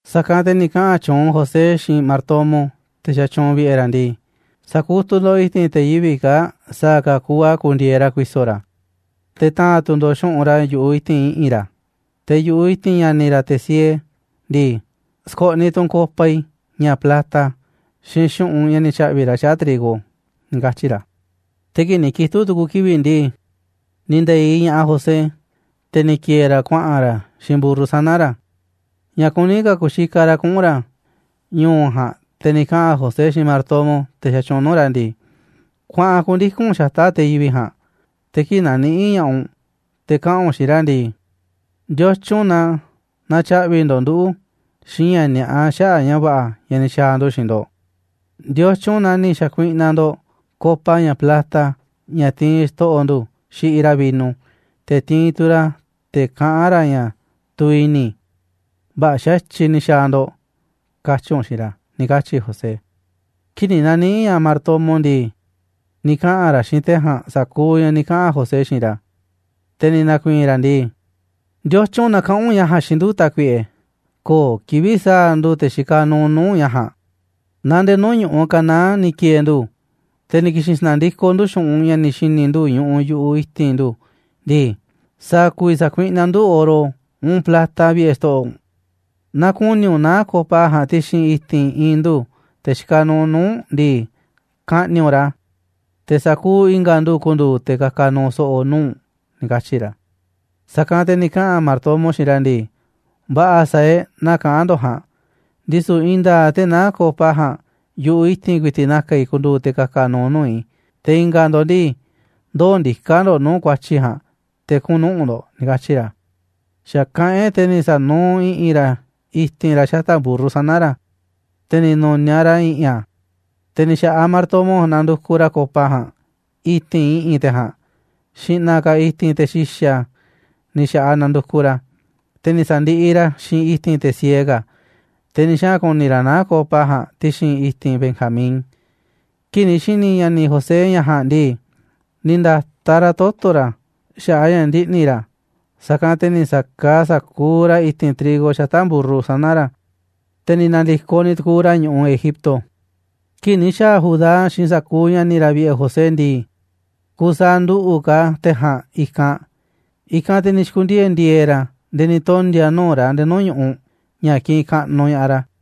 Sa̱kanꞌ te̱ ni̱ kaꞌa̱n tyuunꞌ José xiinꞌ martomo, te̱ xatyuunꞌ vi̱ꞌe̱ ra̱ ndii: ―Sa̱kutuꞌ ndo̱ꞌ i̱ti̱n te̱ yivi̱ꞌ kaa̱ꞌ sa̱a̱ ka̱ kuuꞌ a̱ ku̱ndi̱e̱eꞌ ra̱ ku̱i̱so̱ ra̱, te̱ ta̱a̱nꞌ tu̱ ndo̱ꞌ xu̱ꞌunꞌ ra̱ yu̱ꞌuꞌ i̱ti̱n i̱ꞌi̱n ra̱. te̱ yu̱ꞌuꞌ i̱ti̱n ña̱ni̱ ra̱, te̱ siee ndii, sko̱ꞌniꞌ tu̱ u̱nꞌ copa i̱, ña̱ plata, xiinꞌ xu̱ꞌunꞌ ña̱ ni̱ tya̱ꞌvi̱ ra̱ xaꞌa̱ꞌ trigo ―ni̱ katyi̱ ra̱. Te̱ kii̱ꞌ ni̱ kitu̱ꞌ tu̱ku̱ kivi̱ꞌ ndii, ni̱ nde̱iꞌ ña̱ꞌaꞌ José, te̱ ni̱ ki̱e̱e̱ ra̱ kuaꞌa̱n ra̱ xiinꞌ mburru sana̱ ra̱. Ña̱ kuní ka̱ ku̱xikaꞌ ra̱ kuꞌu̱n ra̱ ñu̱u̱ ja̱a̱nꞌ, te̱ ni̱ kaꞌa̱n José xiinꞌ martomo, te̱ xatyuunꞌ nuu̱ꞌ ra̱ ndii: ―Kuaꞌa̱n ku̱ndiku̱n u̱nꞌ xata̱ꞌ te̱ yivi̱ꞌ ja̱a̱nꞌ, te̱ kii̱ꞌ na̱niꞌi̱ꞌ ña̱ꞌaꞌ u̱nꞌ te̱ kaꞌa̱n u̱nꞌ xiinꞌ ra̱ ndii: “¿Ndiotyun na natyaꞌvi̱ ndo̱ꞌ nduꞌu̱ xiinꞌ ña̱ ni̱a̱ꞌa xaꞌa̱ꞌ ña̱ va̱ꞌa̱ ña̱ ni̱ xa̱a̱ ndu̱ xiinꞌ ndo̱ꞌ? ¿Ndiotyun na ni̱ xa̱kuiꞌnaꞌ ndo̱ꞌ copa, ña̱ plata, ña̱ tiinꞌ xto̱ꞌo̱ ndu̱ xiꞌiꞌ ra̱ vino, te̱ tiinꞌ tu̱ ra̱ a̱ te̱ kaꞌán ra̱ ña̱ tuviꞌ i̱ni̱? Vä̱ꞌa̱ xa̱tyiꞌ ni̱ xaa̱ ndo̱ꞌ”, katyi̱ u̱nꞌ xiinꞌ ra̱ ―ni̱ katyi̱ José. Kii̱ꞌ ni̱ na̱niꞌi̱ꞌ ña̱ꞌaꞌ martomo ndii, ni̱ kaꞌa̱n ra̱ xiinꞌ te̱ ja̱a̱nꞌ sa̱kuuꞌ ña̱ ni̱ kaꞌa̱n José xiinꞌ ra̱. Te̱ ni̱ na̱ku̱i̱i̱n ra̱ ndii: ―¿Ndiotyun na kaꞌán u̱nꞌ ña̱ ja̱a̱nꞌ xiinꞌ ndu̱, tákuiꞌe? Köo̱ꞌ kivi̱ꞌ sa̱a̱ ndu̱, te̱ xikaꞌ nuuꞌ nuu̱ꞌ u̱nꞌ, ña̱ ja̱a̱nꞌ. Naaꞌ ndee nuu̱ꞌ ñu̱ꞌuꞌ Canaán ni̱ ki̱e̱e̱ ndu̱, te̱ ni̱ ki̱xi̱n sa̱na̱ndikoꞌ ndu̱ xu̱ꞌunꞌ ña̱ ni̱ xi̱ni̱ ndu̱ ñuꞌuꞌ yu̱ꞌuꞌ i̱ti̱n ndu̱ ndii, ¿sa̱a̱ ku̱vi̱ sa̱kuiꞌnaꞌ ndu̱ oro, uun plata vi̱ꞌe̱ xto̱ꞌo̱ u̱nꞌ? Naaꞌ ku̱ni̱ u̱nꞌ naá copa ja̱a̱nꞌ ti̱xi̱n i̱ti̱n i̱i̱n ndu̱, te̱ xikaꞌ nuuꞌ nuu̱ꞌ u̱nꞌ ndii, ka̱ꞌni̱ꞌ u̱nꞌ ra̱, te̱ sa̱kuuꞌ i̱nga̱ ndu̱ ku̱ndu̱u̱ te̱ ka̱ka̱ nu̱u̱ so̱ꞌo̱ nuu̱ꞌ u̱nꞌ ―ni̱ katyi̱ ra̱. Sa̱kanꞌ te̱ ni̱ kaꞌa̱n martomo xiinꞌ ra̱ ndii: ―Va̱ꞌa̱, sa̱a̱ e̱ꞌ naa kaꞌán ndo̱ꞌ ja̱a̱nꞌ, ndisu̱ i̱i̱n nda̱a̱ꞌ te̱ naá copa ja̱a̱nꞌ yu̱ꞌuꞌ i̱ti̱n ku̱i̱ti̱ꞌ na̱ka̱ i̱ ku̱ndu̱u̱ te̱ ka̱ka̱ nu̱u̱ nuu̱ꞌ i̱, te̱ i̱nga̱ ndo̱ꞌ ndii, ndoo̱ ndiká ndo̱ꞌ nuu̱ꞌ ku̱a̱tyi̱ ja̱a̱nꞌ te̱ kuꞌu̱n nuꞌu̱ꞌ ndo̱ꞌ ―ni̱ katyi̱ ra̱. Xa̱ kaꞌán e̱ꞌ, te̱ ni̱ sa̱nuuꞌ i̱ꞌi̱n ra̱ i̱ti̱n ra̱ xata̱ꞌ mburru sana̱ ra̱, te̱ ni̱ nu̱niaꞌ ra̱ i̱ꞌi̱n a̱. Te̱ ni̱ xa̱ꞌaꞌ martomo ja̱a̱nꞌ nandukuꞌ ra̱ copa ja̱a̱nꞌ i̱ti̱n i̱ꞌi̱n te̱ ja̱a̱nꞌ, xi̱ꞌna̱ ka̱ i̱ti̱n te̱ xi̱xa̱ ni̱ xa̱ꞌaꞌ nandukuꞌ ra̱ a̱, te̱ ni̱ sa̱ndiꞌiꞌ ra̱ xiinꞌ i̱ti̱n te̱ siee ka̱, te̱ ni̱ xaꞌa̱n ku̱ni̱ ra̱ naá copa ja̱a̱nꞌ ti̱xi̱n i̱ti̱n Benjamín. Kii̱ꞌ ni̱ xi̱ni̱ ña̱ni̱ José ña̱ ja̱a̱nꞌ ndii, ni̱ nda̱taꞌ ra̱ toto̱ ra̱ xaꞌa̱ꞌ a̱ ña̱ ndiꞌni̱ ra̱, sa̱kanꞌ te̱ ni̱ sa̱kaaꞌ sa̱kuuꞌ ra̱ i̱ti̱n trigo xata̱ꞌ mburru sana̱ ra̱, te̱ ni̱ na̱ndi̱koꞌ ni̱ tu̱ku̱u̱ ra̱ ñu̱ꞌuꞌ Egipto. Kii̱ꞌ ni̱ xa̱a̱ Judá xiinꞌ sa̱kuuꞌ ña̱ni̱ ra̱ vi̱ꞌe̱ José ndii, kusaaꞌ nduꞌu̱ꞌ ka̱ te̱ ja̱a̱nꞌ i̱kanꞌ, i̱kanꞌ te̱ ni̱ xi̱ku̱ndiee̱ ndi̱e̱e̱ ra̱ nde̱e̱ ni̱ tondi̱a̱ nuu̱ꞌ ra̱ nde̱e̱ nuu̱ꞌ ñu̱ꞌuꞌ ña̱ kiꞌinꞌ kaꞌnuꞌ ña̱ꞌaꞌ ra̱.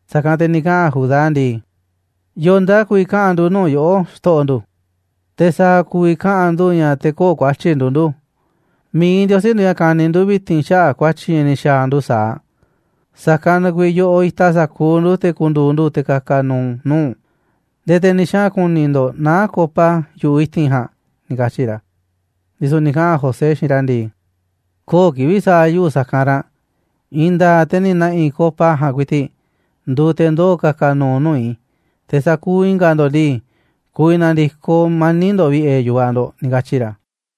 Sa̱kanꞌ te̱ ni̱ kaꞌa̱n Judá ndii: ―¿Yo̱o̱ nduuꞌ a̱ ku̱vi̱ kaꞌa̱n ndu̱ nuu̱ꞌ yoꞌó, xto̱ꞌo̱ ndu̱? Te̱, ¿sa̱a̱ ku̱vi̱ kaꞌa̱n ndu̱ ña̱ te̱ köo̱ꞌ ku̱a̱tyi̱ nduuꞌ ndu̱? Mi̱iꞌ Ndiosí nduuꞌ ña̱ kaniꞌ ndu̱ vi̱ti̱n xaꞌa̱ꞌ ku̱a̱tyi̱ ña̱ ni̱ xa̱a̱ ndu̱ sa̱aꞌ. Sa̱kanꞌ na kuiiꞌ yoꞌoꞌ itaꞌ sa̱kuuꞌ ndu̱, te̱ ku̱ndu̱u̱ ndu̱ te̱ ka̱ka̱ nu̱u̱ nuu̱ꞌ u̱nꞌ, nde̱e̱ te̱ ni̱ xaꞌa̱n ku̱ni̱ ndo̱ꞌ naá copa yu̱ꞌuꞌ i̱ti̱n ja̱a̱nꞌ ―ni̱ katyi̱ ra̱. Ndisu̱ ni̱ kaꞌa̱n José xiinꞌ ra̱ ndii: ―Köo̱ꞌ kivi̱ꞌ sa̱a̱ yuꞌu̱ sa̱kanꞌ ranꞌ, i̱i̱n nda̱a̱ꞌ te̱ ni̱ na̱ꞌi̱ copa ja̱a̱nꞌ ku̱i̱ti̱ꞌ nduuꞌ te̱ ndoo̱ ka̱ka̱ nu̱u̱ nuu̱ꞌ i̱, te̱ sa̱kuuꞌ i̱nga̱ ndo̱ꞌ ndii, ku̱vi̱ na̱ndi̱koꞌ mani̱ꞌ ndo̱ꞌ vi̱ꞌe̱ yu̱vaꞌ ndo̱ꞌ ―ni̱ katyi̱ ra̱.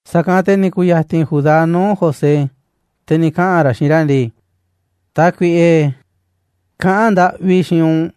Sa̱kanꞌ te̱ ni̱ ku̱ya̱ti̱n Judá nuu̱ꞌ José, te̱ ni̱ kaꞌa̱n ra̱ xiinꞌ ra̱ ndii: ―Tákuiꞌe, kaꞌán ndaꞌvi i̱ xiinꞌ u̱nꞌ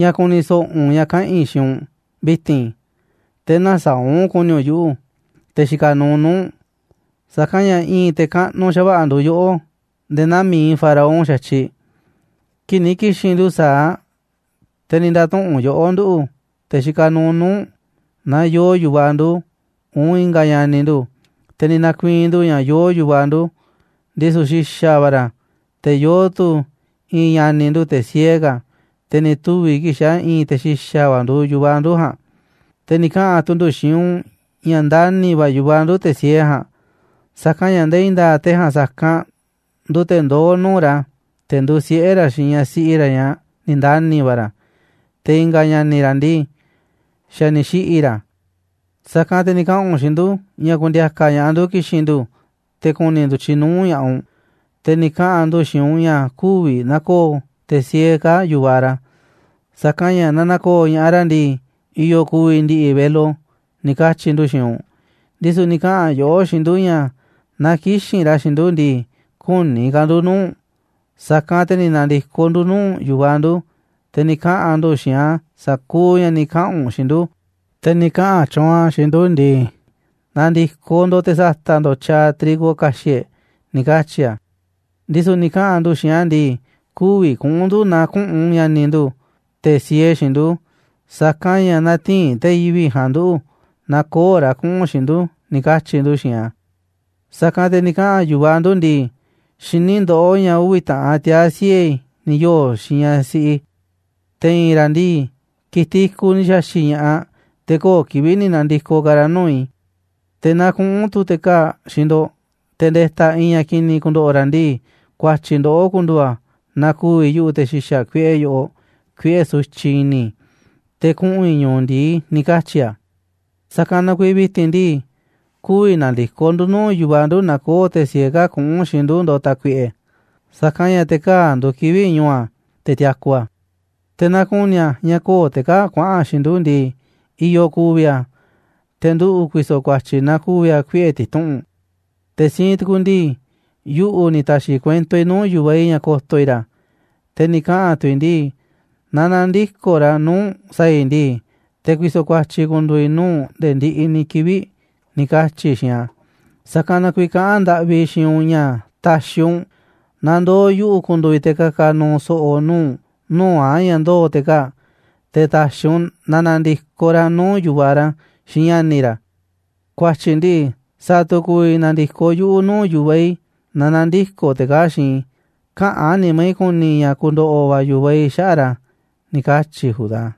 ña̱ ku̱ni̱ so̱ꞌo̱ u̱nꞌ ña̱ kaꞌa̱n i̱ xiinꞌ u̱nꞌ vi̱ti̱n, te̱ nä̱saa̱ꞌ u̱nꞌ ku̱ni̱ u̱nꞌ yuꞌu̱, te̱ xikaꞌ nuuꞌ nuu̱ꞌ u̱nꞌ, sa̱kanꞌ ña̱ i̱i̱n te̱ kaꞌnuꞌ xa̱va̱ꞌa̱ nduuꞌ yoꞌó nde̱e̱ naa mi̱iꞌ Faraón xa̱tyiꞌ. Kii̱ꞌ ni̱ ki̱xi̱n ndu̱ sa̱aꞌ, te̱ ni̱ nda̱tuꞌu̱nꞌ yoꞌó nduꞌu̱, te̱ xikaꞌ nuuꞌ nuu̱ꞌ u̱nꞌ, naaꞌ yooꞌ yu̱vaꞌ ndu̱, uun i̱nga̱ ña̱ni̱ ndu̱, te̱ ni̱ na̱ku̱i̱i̱n ndu̱ ña̱ yoo yu̱vaꞌ ndu̱, ndisu̱ xi̱xa̱ va̱ ra̱, te̱ yoo tu̱ i̱i̱n ña̱ni̱ ndu̱, te̱ siee ka̱, te̱ ni̱ tuvi̱ kii̱ꞌ xa̱ i̱i̱n te̱ xi̱xa̱ va̱ nduuꞌ yu̱vaꞌ ndu̱ ja̱a̱nꞌ. Te̱ ni̱ kaꞌa̱n tu̱ ndu̱ xiinꞌ u̱nꞌ ña̱ ndani̱ va̱ yu̱vaꞌ ndu̱ te̱ siee ja̱a̱nꞌ, sa̱kanꞌ ña̱ ndee i̱i̱n nda̱a̱ꞌ te̱ ja̱a̱nꞌ sa̱kanꞌ nduuꞌ te̱ ndoó nuu̱ꞌ ra̱, te̱ nduuꞌ siꞌe̱ ra̱ xiinꞌ ñaꞌ siꞌi ra̱, ñaꞌ ni̱ ndani̱ va̱ ra̱, te̱ i̱nga̱ ña̱ni̱ ra̱ ndii, xa̱ ni̱ xiꞌi̱ ra̱. Sa̱kanꞌ te̱ ni̱ kaꞌa̱n u̱nꞌ xiinꞌ ndu̱ ña̱ ku̱ndi̱a̱ka̱ ña̱ꞌaꞌ ndu̱ ki̱xi̱n ndu̱ te̱ ku̱ni̱ ndu̱tyiꞌ nuu̱ꞌ ña̱ꞌaꞌ u̱nꞌ. Te̱ ni̱ kaꞌa̱n ndu̱ xiinꞌ u̱nꞌ ña̱ kü̱vi̱ na̱ko̱o̱ te̱ siee kaa̱ꞌ yu̱vaꞌ ra̱, sa̱kanꞌ ña̱, naaꞌ na̱ko̱o̱ ña̱ꞌaꞌ ra̱ ndii, i̱yo̱ ku̱vi̱ ndi̱ꞌi̱ velo, ni̱ katyi̱ ndu̱ xiinꞌ u̱nꞌ. Ndisu̱ ni̱ kaꞌa̱n yoꞌó xiinꞌ ndu̱ ña̱ naaꞌ kï̱xi̱n ra̱ xiinꞌ ndu̱ ndii, kü̱ni̱ ka̱ ndu̱ nuu̱ꞌ u̱nꞌ. Sa̱kanꞌ te̱ ni̱ na̱ndi̱koꞌ ndu̱ nuu̱ꞌ yu̱vaꞌ ndu̱, te̱ ni̱ kaꞌa̱n ndu̱ xiinꞌ a̱ sa̱kuuꞌ ña̱ ni̱ kaꞌa̱n u̱nꞌ xiinꞌ ndu̱. Te̱ ni̱ kaꞌa̱n tyuunꞌ a̱ xiinꞌ ndu̱ ndii: “Na̱ndi̱koꞌ ndo̱ꞌ te̱ sa̱ta̱ꞌ ndo̱ꞌ tyaaꞌ trigo ka̱xi̱ꞌ e̱ꞌ”, ni̱ katyi̱ a̱. Ndisu̱ ni̱ kaꞌa̱n ndu̱ xiinꞌ a̱ ndii: “Kü̱vi̱ kuꞌu̱n ndu̱ naaꞌ küꞌu̱n ña̱ni̱ ndu̱, te̱ siee xiinꞌ ndu̱, sa̱kanꞌ ña̱ nä̱ti̱i̱n te̱ yivi̱ꞌ ja̱a̱nꞌ nduꞌu̱, naaꞌ köo̱ꞌ ra̱ kuꞌu̱n xiinꞌ ndu̱”, ni̱ katyi̱ ndu̱ xiinꞌ a̱. Sa̱kanꞌ te̱ ni̱ kaꞌa̱n yu̱vaꞌ ndu̱ ndii: “Xiní ndoꞌó ña̱ uvi̱ taꞌan tiaa̱ siꞌe̱ i̱ ni̱ yoo̱ xiinꞌ ñaꞌ siꞌi i̱, te̱ i̱i̱n ra̱ ndii, ki̱tiꞌ i̱kuꞌ ni̱ xa̱xi̱ꞌ ña̱ꞌaꞌ, te̱ köo̱ꞌ kivi̱ꞌ ni̱ na̱ndi̱koꞌ ka̱ ra̱ nuu̱ꞌ i̱. Te̱ naaꞌ kuꞌu̱n tu̱ te̱ kaa̱ꞌ xiinꞌ ndo̱ꞌ, te̱ nde̱ta̱ i̱i̱n ña̱ ki̱ni̱ ku̱ndo̱ꞌo̱ ra̱ ndii, ku̱a̱tyi̱ ndoꞌó ku̱ndu̱u̱ a̱ naaꞌ ku̱vi̱ yuꞌu̱ te̱ xi̱xa̱ kuiꞌe yoꞌoꞌ kuiꞌe̱ sutyiꞌ i̱ni̱, te̱ kuꞌu̱n i̱ ñu̱u̱ ndi̱i”, ni̱ katyi̱ a̱. Sa̱kanꞌ na kuiiꞌ vi̱ti̱n ndii, kü̱vi̱ na̱ndi̱koꞌ ndu̱ nuu̱ꞌ yu̱vaꞌ ndu̱ naaꞌ köo̱ꞌ te̱ siee kaa̱ꞌ kuꞌu̱n xiinꞌ ndu̱ ndo̱ꞌ, tákuiꞌe, sa̱kanꞌ ña̱ te̱ kaa̱ꞌ nduuꞌ kivi̱ꞌ ñu̱u̱ a̱ te̱ tiaku a̱. Te̱ naaꞌ ku̱ni̱ a̱ ña̱ köo̱ꞌ te̱ kaa̱ꞌ kuaꞌa̱n xiinꞌ ndu̱ ndii, i̱yo̱ ku̱vi̱ a̱. Te̱ nduꞌu̱ ku̱i̱so̱ ku̱a̱tyi̱ naaꞌ ku̱vi̱ a̱ kuiꞌe̱ ti̱tuꞌu̱nꞌ. Te̱ siinꞌ tu̱ku ndii, yuꞌu̱ ni̱ ta̱xi̱ kuento i̱ nuu̱ꞌ yu̱vaꞌ i̱ ña̱ ko̱to̱ i̱ ra̱, te̱ ni̱ kaꞌa̱n tu̱ i̱ ndii: “Naaꞌ nä̱ndi̱koꞌ ra̱ nuu̱ꞌ u̱nꞌ sa̱a̱ i̱ ndii, te̱ ku̱i̱so̱ ku̱a̱tyi̱ ku̱ndu̱u̱ i̱ nuu̱ꞌ u̱nꞌ nde̱e̱ ndiꞌiꞌ ni̱ kivi̱ꞌ”, ni̱ katyi̱ i̱ xiinꞌ a̱. Sa̱kanꞌ na kuiiꞌ kaꞌán ndaꞌvi i̱ xiinꞌ u̱nꞌ ña̱ ta̱xi̱ u̱nꞌ na ndoo̱ yuꞌu̱ ku̱ndu̱u̱ i̱ te̱ ka̱ka̱ nu̱u̱ so̱ꞌo̱ nuu̱ꞌ u̱nꞌ nuu̱ꞌ a̱ ña̱ ndoo̱ te̱ kaa̱ꞌ, te̱ ta̱xi̱ u̱nꞌ na na̱ndi̱koꞌ ra̱ nuu̱ꞌ yu̱vaꞌ ra̱, xiinꞌ ña̱ni̱ ra̱. Ku̱a̱tyi̱ ndii, sa̱a̱ tu̱ ku̱vi̱ na̱ndi̱koꞌ yuꞌu̱ nuu̱ꞌ yu̱vaꞌ i̱ naaꞌ nä̱ndi̱koꞌ te̱ kaa̱ꞌ xiinꞌ i̱, käꞌán nimá i̱ ku̱ni̱ i̱ ña̱ ku̱ndo̱ꞌo̱ va̱ yu̱vaꞌ i̱ xaꞌa̱ꞌ ra̱ ―ni̱ katyi̱ Judá.